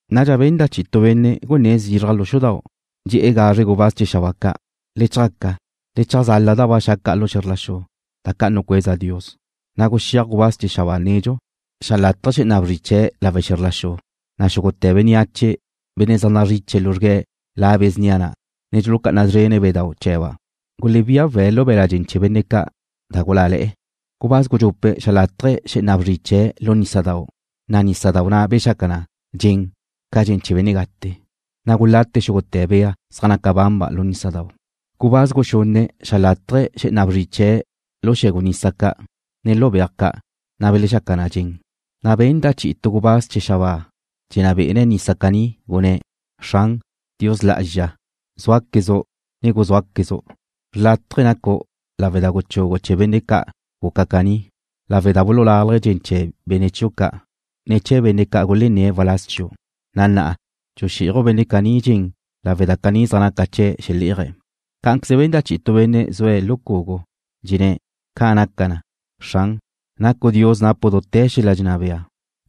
Nadxa benda' chi'i tu benne' gunné̱' zizraj lu xudau'. Dxe̱'e̱ gazre gubáz chee̱ xabáa ca': ―Le chjaca, le cheajzala da ba xa' ca' lu xe̱zr la xu, da ca' nucueza Dios. Na' guxéaj gubáz chee̱ xabáa nedxu, xeajlatje̱' xé'ena bzri chee̱' lawe' xe̱zr la xu, na' xúgute̱ bénneache, benne' zaj nazriche luzrgue̱' la be̱ snia na', ne dxulucá'ana szrene̱' bedau' chee̱ba', gulebía we̱' lu be̱la' dxen chee̱ benne' ca' da gulále̱'e̱ na. Gubáz gudxupe' xeajlatje̱' xé'ena bzri chee̱' lu nísadau', na' nísadau' na' bexaca na dxen ca dxen chee̱ benne' gate, na' gulate xúgute̱ bea zaj naca banba' lu nísadau' na'. Gubáz guxunne' xeajlatje̱' xé'ena bzri chee̱' lu xe̱gu nisa ca', ne lu beaj ca', na' belexaca na dxen. Na' benda' chi'i tu gubáz chee̱ xabáa dxenná be'ene̱' nisa caní, gunné̱': ―Xran, Dios Lá'azxa, zúaquezu', ne guzúaquezu'. Xrlátaje̱ nacu' lawe' da guchugu' chee̱ benne' ca' guca caní, lawe' da bululalje̱' dxen chee̱ benne' chiu' ca', ne chee̱ benne' ca' gulenné̱' waláz chiu', na' na'a dxuxí'aju' benne' caní dxen lawe' da caní zaj naca chee̱' xelé'aje̱'. Cá'anqueze benda' chi'i tu benne' zue̱' lu cugu, dxenné̱': ―Ca' naca na, Xran. Nacu' Dios napu' dute̱ xel-la' dxenná bea.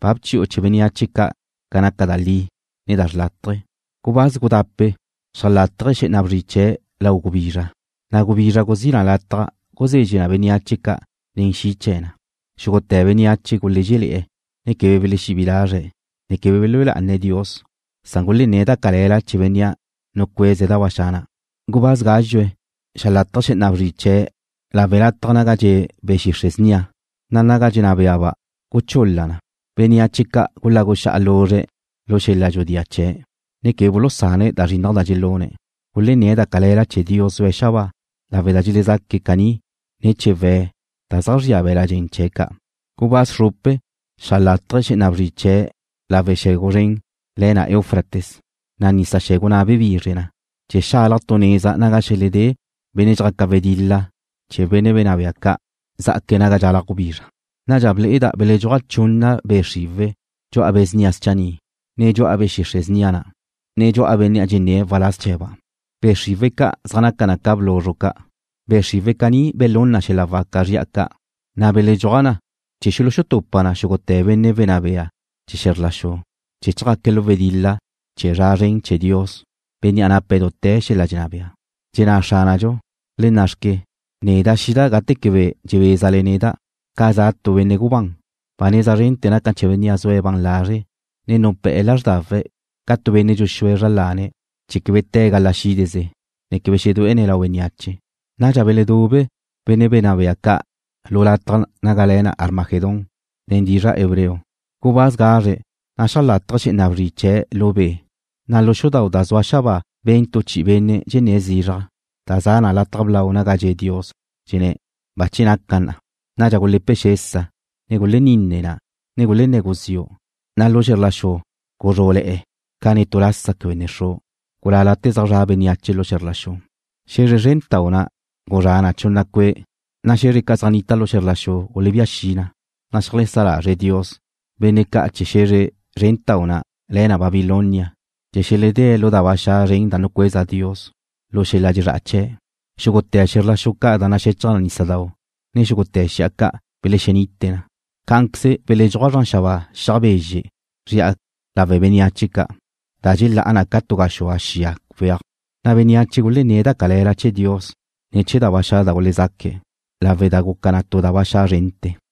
Ba bchi'u chee̱ bénneache ca' ca naca da li, ne da xrlátaje̱. Gubáz gudape' xeajlatje̱' xé'ena bzri chee̱' lau gubizra, na' gubizra guzí na lataj guzezxe na bénneache ca' nen xi' chee̱ na. Xúgute̱ bénneache gulézxele̱'e̱, ne quebe belexebí'i lazre̱', ne quebe belúe lá'ane̱' Dios, san gulenné̱' da cale̱la chee̱ Bénnea' nucueze̱' da ba xa' na'. Gubáz gázxue xeajlatje̱' xé'ena bzri chee̱' lawe' lataj naga dxe' be̱ xixre' snia, na' naga dxenná beaba' guchul-la na. Bénneache ca' gulagu xa'a luzre̱' lu xel-la' dxudía chee̱', ne quebe bulusane̱' da zrinnaj da dxelune̱'. Gulenné̱' da cale̱la chee̱ Dios zue̱' xabáa, lawe' da dxelezaque̱' caní ne̱ chee̱ we̱' da zaj zria be̱la' dxen chee̱' ca'. Gubáz xrupe xeajlatje̱' xé'ena bzri chee̱' lawe' xe̱gu zren le̱ na Eufrates, na' nisa xe̱gu na' bebizre na, chee̱ xalaj tu neza naga xeledé benne' dxjaca wedil-la chee̱ benne' wenná bea ca' zá'aque̱' naga dxalaj gubizra. Nadxa ble'eda' beledxúaj chunna be' xriwe̱' dxu'a be̱ snia schanni', ne dxu'a be̱ xixre' snia na', ne dxu'a benne' dxenné̱' waláz chee̱ba'. Be' xriwe̱' ca' zaj naca na ca bluzru ca'. Be' xriwe̱' caní belún na xel-la' waca zri'a ca', na' beledxúaj na chee̱ xulutupa na xúgute̱ benne' wenná bea chee̱ xe̱zr la xu, chee̱ chjaque̱' lu wedil-la chee̱ zra zren chee̱ Dios, Bénnea' nape̱' dute̱ xel-la' dxenná bea. Dxenná Xránadxu: ―Le na' xque, neda' xida' gate quebe dxebézale neda', ca za' tu benne' gubán. Ba neza zrente̱ naca na chee̱ bénnea' zue̱' ban lazre' ne nupé̱'e̱ lázrdawe̱' ca tu benne' dxuxúe̱' zra lane̱' chee̱ quebe te̱' gala xídeze, ne quebe xedué'ene̱' lau bénneache. Nadxa beledube̱' benne' wenná bea ca' lu lataj naga le̱ na Armagedón nen dizra' hebreo. Gubáz gazre na' xeajlatje̱' xé'ena bzri chee̱' lu be', na' lu xudau' da zua xabáa ben tu chi'i benne' dxenné̱' zizraj, da za na lataj blau naga dxe' Dios, dxenné̱': ―Bache naca na. Nadxa gule̱pe xesa, ne guleninne na, ne gulenné̱ guziu', na' lu xe̱zr la xu guzrú'le̱'e̱ ca netú lasa quebe ne xru', na' gulálate̱ zaj zra' bénneache lu xe̱zr la xu. Xe̱zre zrentau' na' guzrá na chunna cue', na' xe̱zre ca' zaj nita lu xe̱zr la xu gulebía xi na, na' xeajsá lazre' Dios benne' ca' chee̱ xe̱zre zrentau' na' le̱ na Babilonia chee̱ xeledée̱' lu da ba xa' zren da nucueza Dios lu xel-la' dxezrá'a chee̱'. Xúgute̱ xe̱zr la xu ca' da naxechaj nísadau', ne xúgute̱ xi'a ca' belexenite na. Cá'anqueze belexruj zran xabáa xiaj bezxe' zri'a lawe' bénneache ca', da dxelá'a na ca tu gaxúa xia weaj, na' bénneache ca' gulenné̱' da cale̱la chee̱ Dios ne̱ chee̱ da ba xa' da gulezaque̱', lawe' da guca na tu da ba xa' zrente̱.